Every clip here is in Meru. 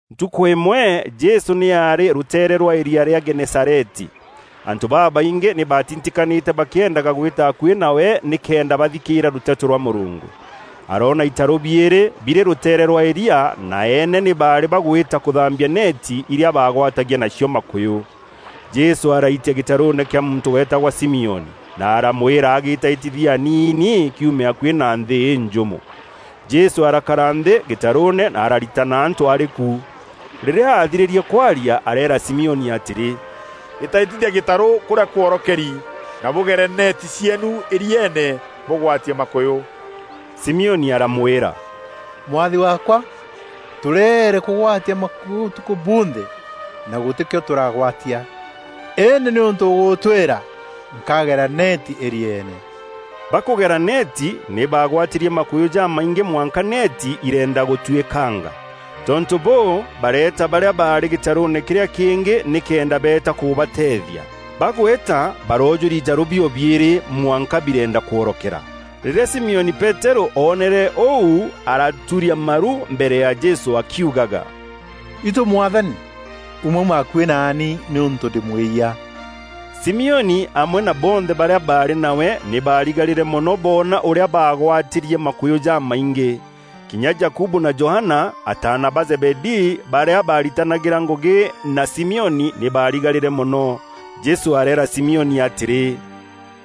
Ntukû îmwe Jesû nî aarî rûteere rwa îria rîa Genesareti. Antû babaingî nî batitikanîte bakîendaga gwîta akuî nawe nîkenda bathikîîra rûteto rwa Mûrungu. Aroona itarû biîrî birî rûteere rwa îria, na eene nî baarî bagwîta kûthambia neeti iria baagwatagia nacio makûyû. Jesû araitia gîtarûûne kîa muntû weetagwa Simioni, na aramwîra agîtaîtithie aniini kiume akuî na nthî înjûmo. Jesû arakara nthî gîtarûûne na araritana antû arî ku. Rîrîa aathirîrie kwaria areera Simioni atîrî, “Îtaîtithia gîtarû kûrîa kworokeri na bûgere neeti cieenu îrieene bûgwatie makûyû.” Simioni aramwîra, “Mwathi waakwa, tûreere kûgwatia makûyû ûtukû bunthe na gûtîkîo tûragwatia! Îndî nîûntû ûgûtwîra, nkagera neeti îrieene.” Bakûgera neeti, nî baagwatîrie makûyû jamaingî mwanka neeti ireenda gûtwîkanga. Tontû bûû, bareeta barîa baarî gîtarûûne kîrîa kîngî nîkenda beeta kûbateethia. Bagwîta baroojûria itarû bio biîrî, mwanka bireenda kworokera. Rîrîa Simioni Peterû oonere ûu, araturia maru mbere ya Jesû akiugaga, “Itû Mwathani, umauma akuî naani nîûntû ndî mwîyia.” Simioni amwe na bonthe barîa baarî nawe nî baarigarîre mono boona ûrîa baagwatîrie makûyû jamaingî. Kinya Jakubu na Johana, ataana ba Zebedii barîa baritanagîria ngûgî na Simioni, nî barigarîre mono. Jesû areera Simioni atîrî,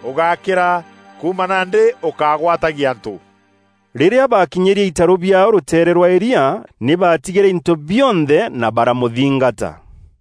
“Ûgákîra, kuuma nandî ûkagwatagia antû.” Rîrîa baakinyîrie itarû biaao rûteere rwa îria, nî baatigîre into bionthe na baramûthingata.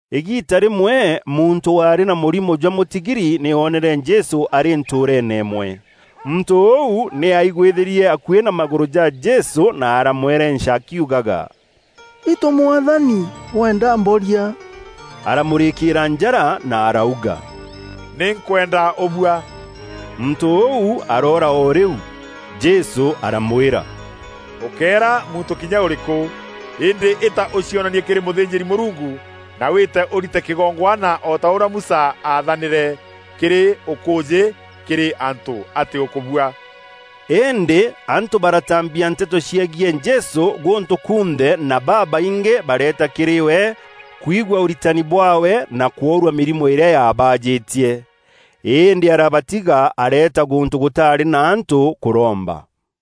Îgiita rîmwe muntû waarî na mûrimo jwa mûtigiri nî oonere Jesû arî ntûûreene îmwe. Muntû ûu nî aigwîthîrie akuî na magûrû ja Jesû na aramwerenca akiugaga, “Itû Mwathani weenda mboria.” Aramûrîkîîra njara na arauga, “Nî nkwenda ûbua!” Muntû ûu aroora o rîu. Jesû aramwîra, “Ûkéera muntû kinya ûrîkû. Îndî îta ûcionanie kîrî mûthînjîri-Mûrungu, na wîte ûrite kîgongwana o ta ûrîa Musa aathanîre, kîrî ûkûûjî kîrî antû atî ûkûbua.” Îndî antû baratambia nteto ciegiî Jesû gûntû kunthe na babaingî bareeta kîrî we kwigua ûritani bwaawe na kworua mîrimo îrîa yaabajîtie. Îndî arabatiga areeta gûntû gûtaarî na antû kûromba.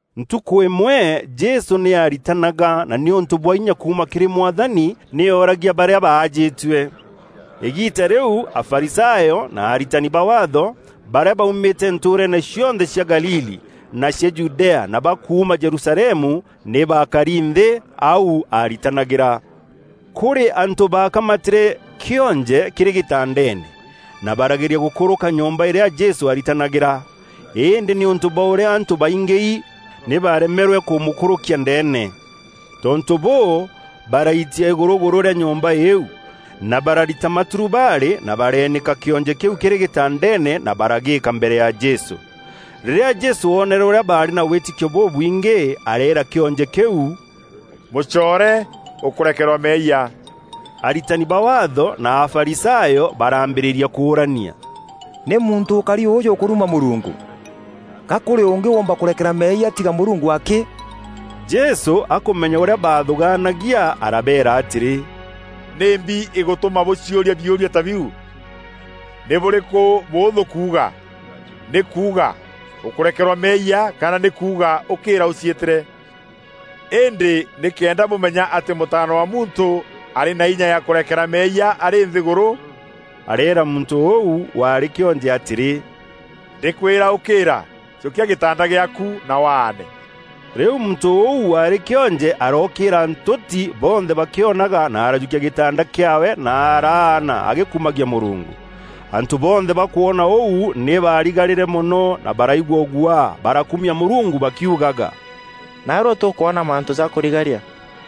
Ntukû îmwe Jesû nî aaritanaga na nîûntû bwa inya kuuma kîrî Mwathani, nî ooragia barîa baajîtue. Îgiita rîu Afarisayo na aritani ba Waatho, barîa baumîte ntûûreene cionthe cia Galili, na cia Judea na ba kuuma Jerusalemu nî baakari nthî au aritanagîra. Kûrî antû bakamatîîre kîonje kîrî gîtandeene, na barageria gûkûrûka nyomba îrîa Jesû aaritanagîra, îndî nîûntû bwa ûrîa antû baingîi nî baaremerwe kûmûkûrûkia ndeene. Tontû bûû, baraitia îgûrûgûrû rîa nyomba îîu, na bararita maturubarî, na bareenîka kîonje kîu kîrî gîtandeene na baragîîka mbere ya Jesû. Rîrîa Jesû oonere ûrîa baarî na wîtîkio bûbwingî, areera kîonje kîu, “Mûcoore, ûkûrekerwa meeyia.” Aritani ba Waatho na Afarisayo baraambîrîria kûûrania, “Nî muntû ûkari ûjû ûkûruma Mûrungu? Ga kûrî ûngî ûûmba kûrekera meeyia tiga Mûrungu akî?” Jesû akûmenya ûrîa baathûgaanagia, arabeera atîrî, “Nîmbi îgûtûma bûciûria biûria ta biu? Nî bûrîkû bûûthû kuuga, nî kuuga, ‘Ûkûrekerwa meeyia,’ kana nî kuuga, ‘Ûkîîra ûciîtîre?’ Îndî nîkenda bûmenya atî Mûtaana wa Muntû arî na inya ya kûrekera meeyia arî nthîgûrû,” areera muntû ûu waarî kîonje atîrî, “Ndîkwîra ûkîîra, jûkia gîtanda gîaaku na waane.” Rîu muntû ûu waarî kîonje arookîîra ntûti bonthe bakîonaga na arajûkia gîtanda kîaawe na araana agîkumagia Mûrungu. Antû bonthe bakwona ûu nî baarigarîre mono na baraigua ûguaa barakumia Mûrungu bakiugaga, “Naarua tûkwona mantû ja kûrigaria.”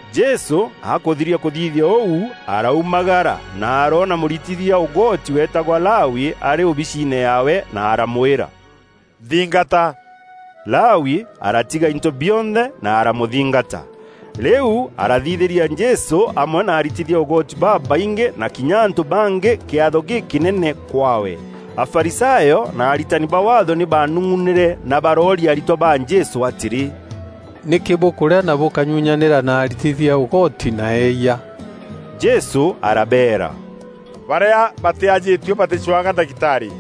Jesû akûthiria kûthithia ûu, araumagara na aroona mûritithia ûgoti weetagwa Lawi arî ûbiciine yaawe na aramwîra, “Nthingata.” Lawi aratiga into bionthe na aramûthingata. Rîu arathithîria Jesû amwe na aritithia ûgoti babaingî na kinya antû bangî kîatho gîkînene kwaawe. Afarisayo na aritani ba Waatho nî baanung'unîre na barooria aritwa ba Jesû atîrî, “Nîkî bûkûrîa na bûkanyunyanîra na aritithia ûgoti na eeyia?” Jesû arabeera, “Barîa batîajîtue batîcwaga ndagitarî,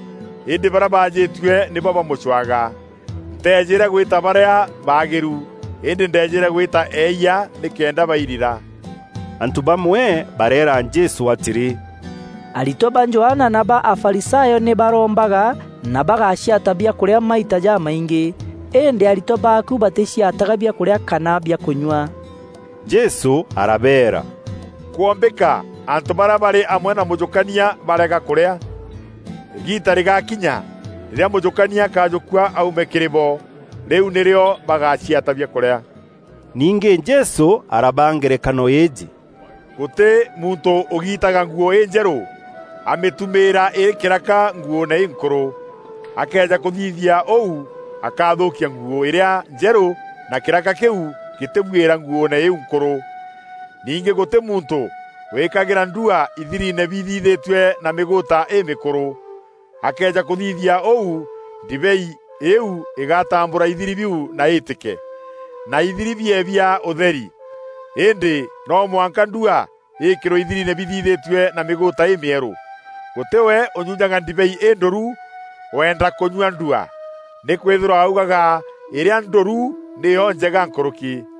îndî barîa bajîtue nîbo bamûcwaga. Nteejîre gwîta barîa baagîru, îndî ndeejîre gwîta eeyia nîkenda bairira.” Antû bamwe bareera Jesû atîrî, “Aritwa ba Johana na ba Afarisayo nî barombaga na bagaciata biakûrîa maita jamaingî. Îndî aritwa baaku batîciataga biakûrîa kana biakûnyua.” Jesû arabeera, “Kwombîka antû barîa barî amwe na mûjûkania bareega kûrîa? Îgiita rîgakinya rîrîa mûjûkania akajûkua aume kîrî bo. Rîu nîrîo bagaciata biakûrîa.” Ningî Jesû arabaa ngerekano îîjî, “Gûtî muntû ûgiitaga nguû înjerû amîtumîîra îrî kîraka nguûûne înkûrû; akëeja kûthithia ûu akathûkia nguû îrîa njerû na kîraka kîu gîtîbuîra nguûne îîu nkûrû. Ningî gûtî muntû wîkagîra ndua ithiriine bithithîtue na mîgûûta îmûkûrû. Akëeja kûthithia ûu ndibei îîu îgatambûra ithiri biu na îîtîke, na ithiri biee bia ûtheri. Îndî no mwanka ndua îîkîrwe ithiriine bithithîtue na mîgûûta îmîerû. Gûtî we ûnyunyaga ndibei îndûru, weenda kûnyua ndua. Nîkwîthîrwa augaga ‘Îrîa ndûru nîyo njega nkûrûki.’”